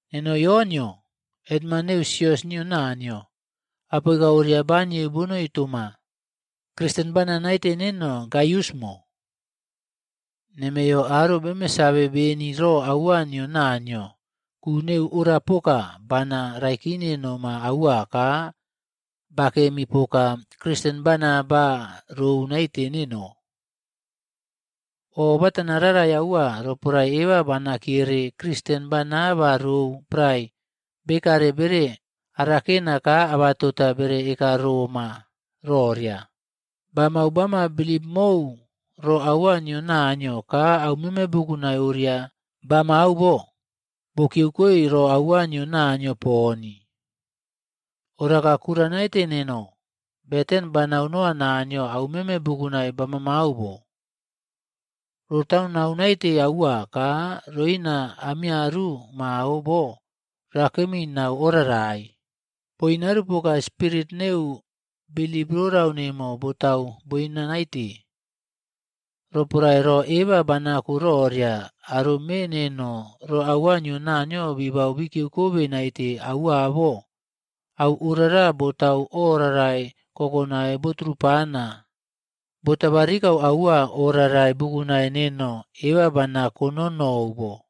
Neno Yonꞌyo, hetman neu sios nio Naniyo, apoika oria banieu bonoi toma, Kristen bana naite neno Gaiusꞌmo. Nemeyo aro beme save beni ro aua nio Naniyo ku neu orapoka bana raikine noma aua ka bakemi poka Kristen bana ba rou naite neno. O botana rarai aua roporae eba bana kiyere Kristen bana ba rou prae bekare bere arakena ka abatota bere ekarooma roria, bamau bama bilip mou ro aua nio Naniyo ka aumeme bukunai oria bamamau bo, bo kikiyeukoe ro aua nio Naniyo poni. Oraka kura naite neno, beten banau noa Naniyo aumeme bukunai bamamau bo, rotaunau naite aua ka roina amiyaru mao bo rakemi nau orarai, boinarupoka spirit neu bilip rorau nemo botau boina naite. Roporae ro eba banako roria aro me neno ro aua nio Naniyo bibau bikiyeukobe naite aua bo, au orara botau o rarai kokonai boturupana botabarikau aua o rarai bukunai neno eba bana kononou bo.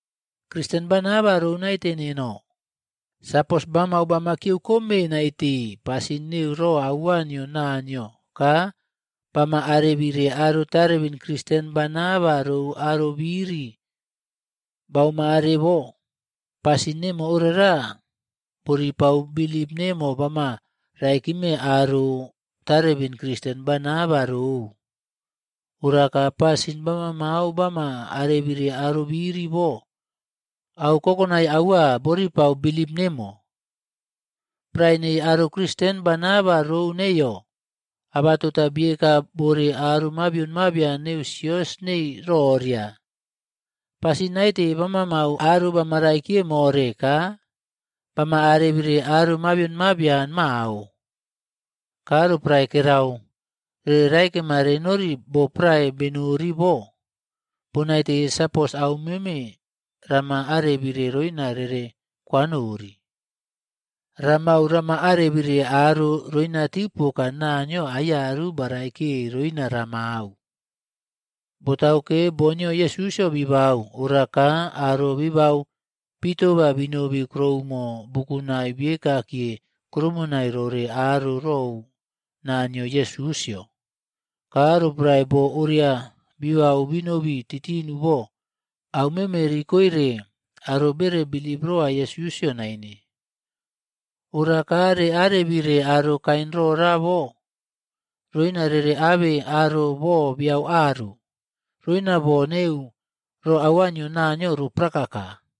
Kristen bana ba rou naite neno, sapos bamau bamakiyeukome naite pasin neu ro aua nio Naniyo ka bama arebire aro tarebin Kristen bana ba rou arobiri baomare bo, pasin nemo orara boripau bilip nemo bama raikime aro tarebin Kristen bana ba rou. Oraka pasin bamamau bama arebire arobiri bo, au kokonai aua boripau bilip nemo. Prae nei aro Kristen bana ba rou neiyo, abatota bieka bore aro mabion mabian neu sios nei roria, pasin naite bamamau aro bamaraikiye more ka bama arebire aro mabion mabian mao. Ka roporae bekare pon beretiarama ka roporae kerau rere raikema renori boprae renori bo, bonaite sapos aumeme rama arebire roina rere kwanori. Ramau rama arebire aro roinatiu poka Naniyo aiyaru baraikiye roina ramau. Botauke, boo nio Yesusꞌyo bibau, ora ka aro bibau bitoba binobi kuroumo bukunai biekakiye krumonai rore aro rou naa nio Yesusꞌyo. Ka roporae boo oria bibau binobi titinu bo, aumeme rikoire aro bere bilip roa Yesusꞌyo naine. Ora ka reꞌarebire aro kain rorabo roina rere abe aro boo beyau aru, roina boo neu ro aua nio Naniyo ro prakaka.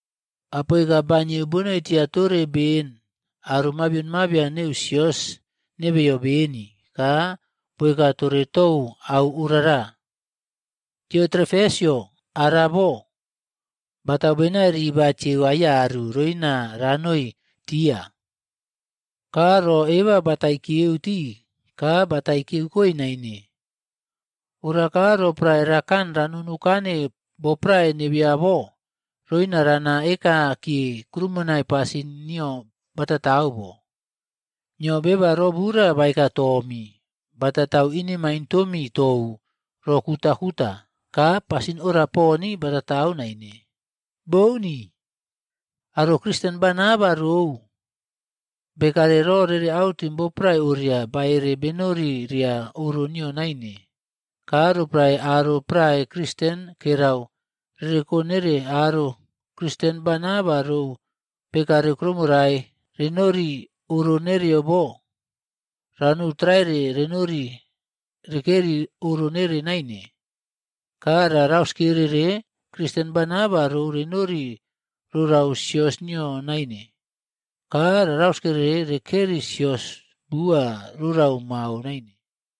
Apoika banieu bonoitia tore ben aro mabian mabion neu sios nebeyo beni ka boeka tore tou au orara. Diotrefesꞌyo ara bo, batau benai ribatieu aiyaru roina ranoi tia. Ka ro eba batai kiyeu tii ka batai kiyeukoe naine. Ora ka roporae rakan ranonukane boprae nebeyo bo, roina rana ekakiye krumonai pasin nio batatau bo. Nio beba robura baeka toomi batau inemaine tomi tou ro kutakuta. Ka pasin ora poni batatau naine. Bouni. Aro Kristen bana ba rou bekare ro rere autim boprae oria baꞌere benori ria oro nio naine. Ka roporae aro prae Kristen kerau rereko nere aro Kristen bana ba rou bekare kuroumo rae rernori oro nereyo bo, ranou traere renori rekeri oro nere naine, ka ra rauskerere Kristen bana ba rou renori rorau sios nio naine ka ra rauskerere rekeri sios bua rorau mao naine.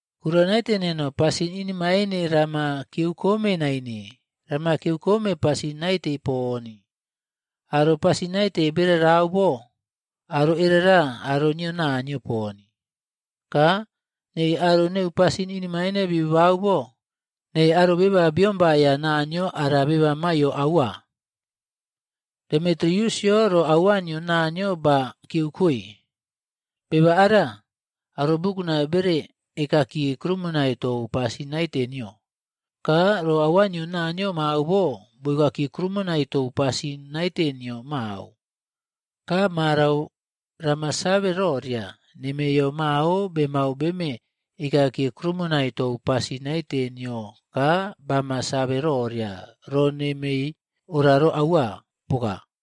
Kura naite neno, pasin inemaine rama kiyerekom naine. Rama kiyerekome pasin naite poni. Aro pasin naite berarau bo, aro erera aro nio Naniyo poni. Ka nei aro neu pasin inemaine bibabau bo, nei aro beba biombaiya Naniyo ara beba maiyo aua. Demitiriusꞌyo ro aua nio Naniyo ba kikiyeukoe, beba ara aro bukunai bere ekakiye krumonai tou pasin naite nio. Ka ro aua nio Naniyo mao bo boekakiye krumonai tou pasin naite nio mao. Ka marau rama save roria nemeiyo mao bemau beme ekakiye krumonai tou pasin naite nio ka bama save roria ro nemei ora aua poka.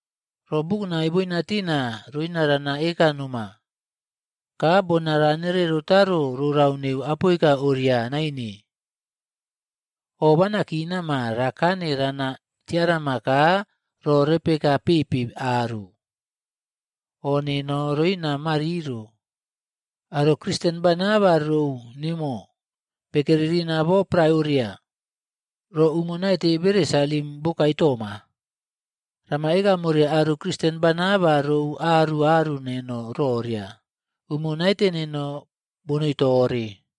Ro bukunai boina tina roina rana eka noma. Ka bona ranere rotaro rorau neu apoika oria naine. Obana kinama rakane rana tiarama ka ro repe eka pepe aru. O nemo roina mariro. Aro Kristen bana ba rou nemo bekeri rina bo prae oria, ro umo naite bere salim bokae toma. Rama ekamore aro Kristen bana ba rou aru aru neno roria, umo naite neno bonoi tore.